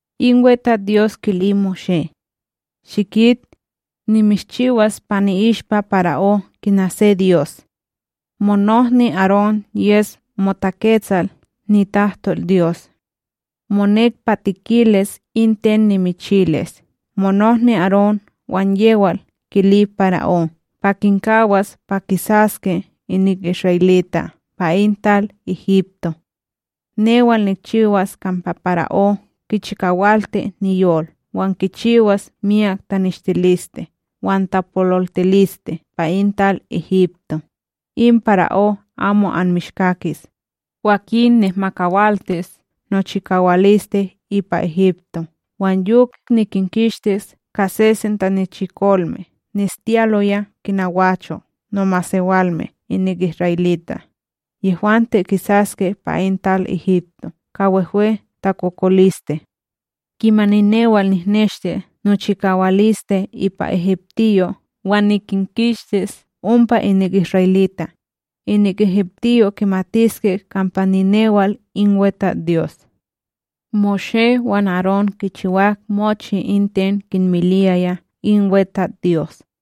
In WeTatsDyos kili Moshé: ―Shikit, nimishchiwas pa ni'ishpa para'ó kina se dyos. Monohni Arón yes motaketsal nitahtol Dyos. Monek pa tikilis in ten nimichilis monohni Arón wan yewal kili para'ó pa kinkawas pa kisaske inik isra'elita' pa in tal Egipto. Newal nikchiwas kampa para'ó kichikawalti niyol wan nikchiwas myak taneshtiliste wan tapololtiliste pa in tal Egipto, in para'ó amo anmishkakis, kwakin nihmakawaltis nochikawaliste ipa Egipto wan yok nikinkistis ka sesen tanichikolme neshtiyaloya kina gwacho' nomasewalme inik isra'elita', yehwante kisaske pa in tal Egipto ka wehwe takokoliste! Kimani newal nihneshti nochikawaliste ipa egiptiyo' wan nikinkistis ompa inik isra'elita', inik egiptiyo' kimatiske kampa ninewal in WeTatsDyos. Moshé wan Arón kichiwak mochi in ten kinmiliyaya in WeTatsDyos.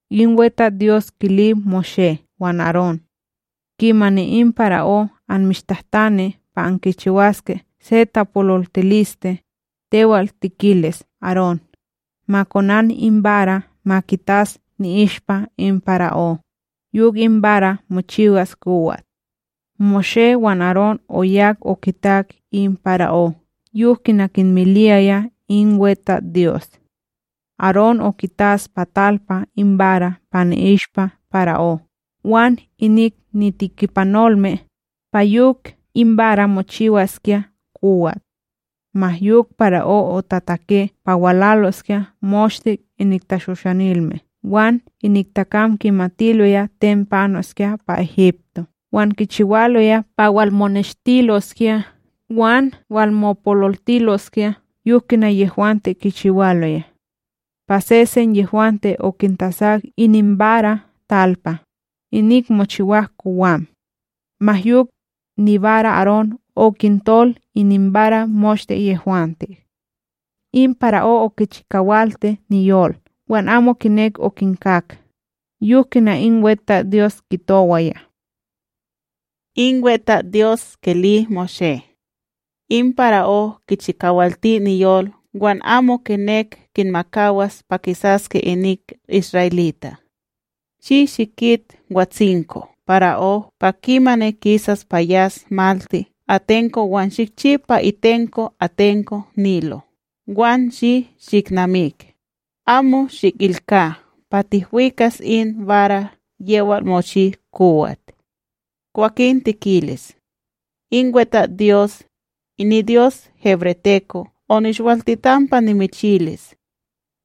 In WeTatsDyos kili Moshé wan Arón: “Kimani in para'ó anmishtahtani pa ankichiwaske se tapololtiliste, tewal tikilis Arón, ma konan in bara ma kitas ni'ishpa in para'ó, yok in bara mochiwas kowat.” Moshé wan Arón oyak okitak in para'ó yok kina kinmiliyaya in WeTatsDyos. Arón okitas pa talpa in bara pa ni'ishpa para'ó wan inik nitekipanolme, pa yok in bara mochiwaskya kowat. Ma yok para'ó otatake pa walaloskya moshte inik tashoshanilme wan inik takam kimatiloya ten panoskya pa Egipto wan kichiwaloya pa walmoneshtiloskya wan walmopololtiloskya yok kina yehwante kichiwaloya: Pa sesen yehwante okintasak ininbara talpa, inik mochiwak kowam. Ma yok, nibara Arón okintol ininbara moshte yehwante. In para'ó okichikawalti niyol wan amo kinek okinkak, yok kina in WeTatsDyos kitowaya. In WeTatsDyos kili Moshé: “In para'ó kichikawalti niyol wan amo kinek kinmakawas pa kisaske inik isra'elita'. Shi shikit watsinko para'ó pa kimani kisas pa yas malti atenko wan shikchi pa itenko atenko Nilo wan shi shiknamik, amo shikilka pa tihwikas in bara yewal mochi kowat. Kwakin tikilis: “In WeTatsDyos, niDyos hebreteko' onishwaltitan pa nimichilis: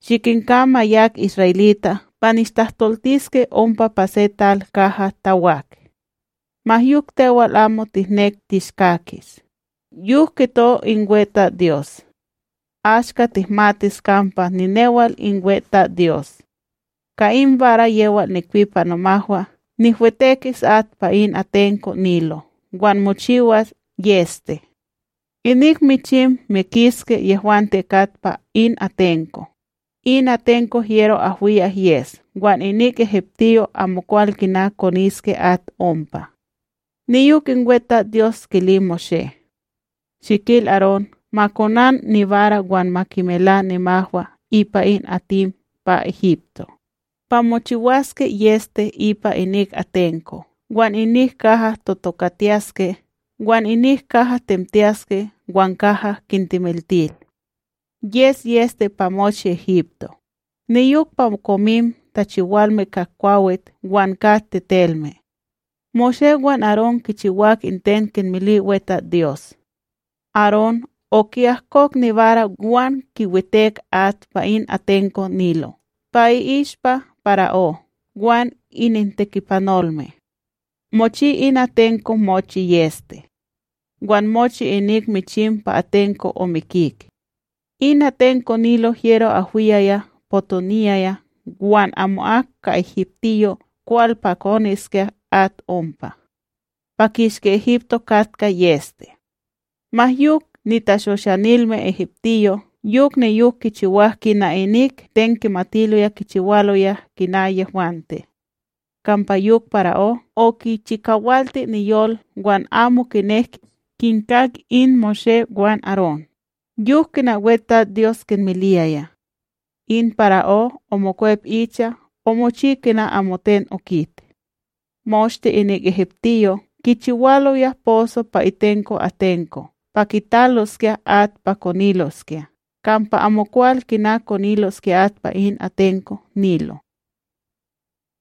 ‘Shikinka ma yak isra'elita' pa nishtahtoltiske ompa pa se tal kaha tawak!’ Ma yok tewal amo tihnek tishkakis, yok kito in WeTatsDyos: ‘Ashka tihmatis kampa ninewal in WeTatsDyos!’ Ka in bara yewal nikpi pa nomahwa nihwetekis at pa in atenko Nilo wan mochiwas yEste. Inik michim mikishke yehwante kat pa in atenko, in atenko hyero ahwiyak yes wan inik egiptiyo' amokwal kina koniske at ompa.’” Niyok in WeTatsDyos kili Moshé: “Shikil Arón ma konan nibara wan ma kimela nimahwa ipa in atim pa Egipto, pa mochiwaske yEste ipa inik atenko' wan inik kaha totokatiyaske wan inik kaha temtiyaske wan kaha kintemiltil. Yes yEste pa mochi Egipto, niyok pa komim tachiwalme ka kwawit wan ka tetelme!” Moshé wan Arón kichiwak in ten kinmili WeTatsDyos. Arón oki'ahkok nibara wan kiwitek at pa in atenko Nilo pa i'ishpa para'ó wan inintekipanolme. Mochi in atenko omochi yEste! Wan mochi inik michim pa atenko omikik. In atenko Nilo hyero ahwiyaya potoniyaya wan amo'ak ka egiptiyo' kwal pa koniskya at ompa. Pa kishki Egipto katkaya yEste. Ma yok nitashoshanilme egiptiyo' yok niyok kichiwak ka inik ten kimatiloya kichiwaloya kina yehwante. Kampa yok para'ó okichikawalti niyol wan amo kinek kinkak in Moshé wan Arón, yok kina WeTatsDyos kinmiliyaya. In para'ó omokwep icha omochi kina amoten okit. Moshte inik egiptiyo' kichiwaloya poso pa itenko atenko pa kitaloskya at pa koniloskya kampa amokwal kina koniloskya at pa in atenko Nilo.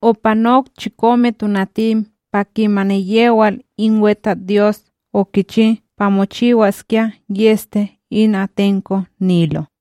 TakokolistePlaga ka in rana' Opanok chikome tonatim pa kimani yewal in WeTatsDyos okichi pa mochiwaskya yEste in atenko Nilo.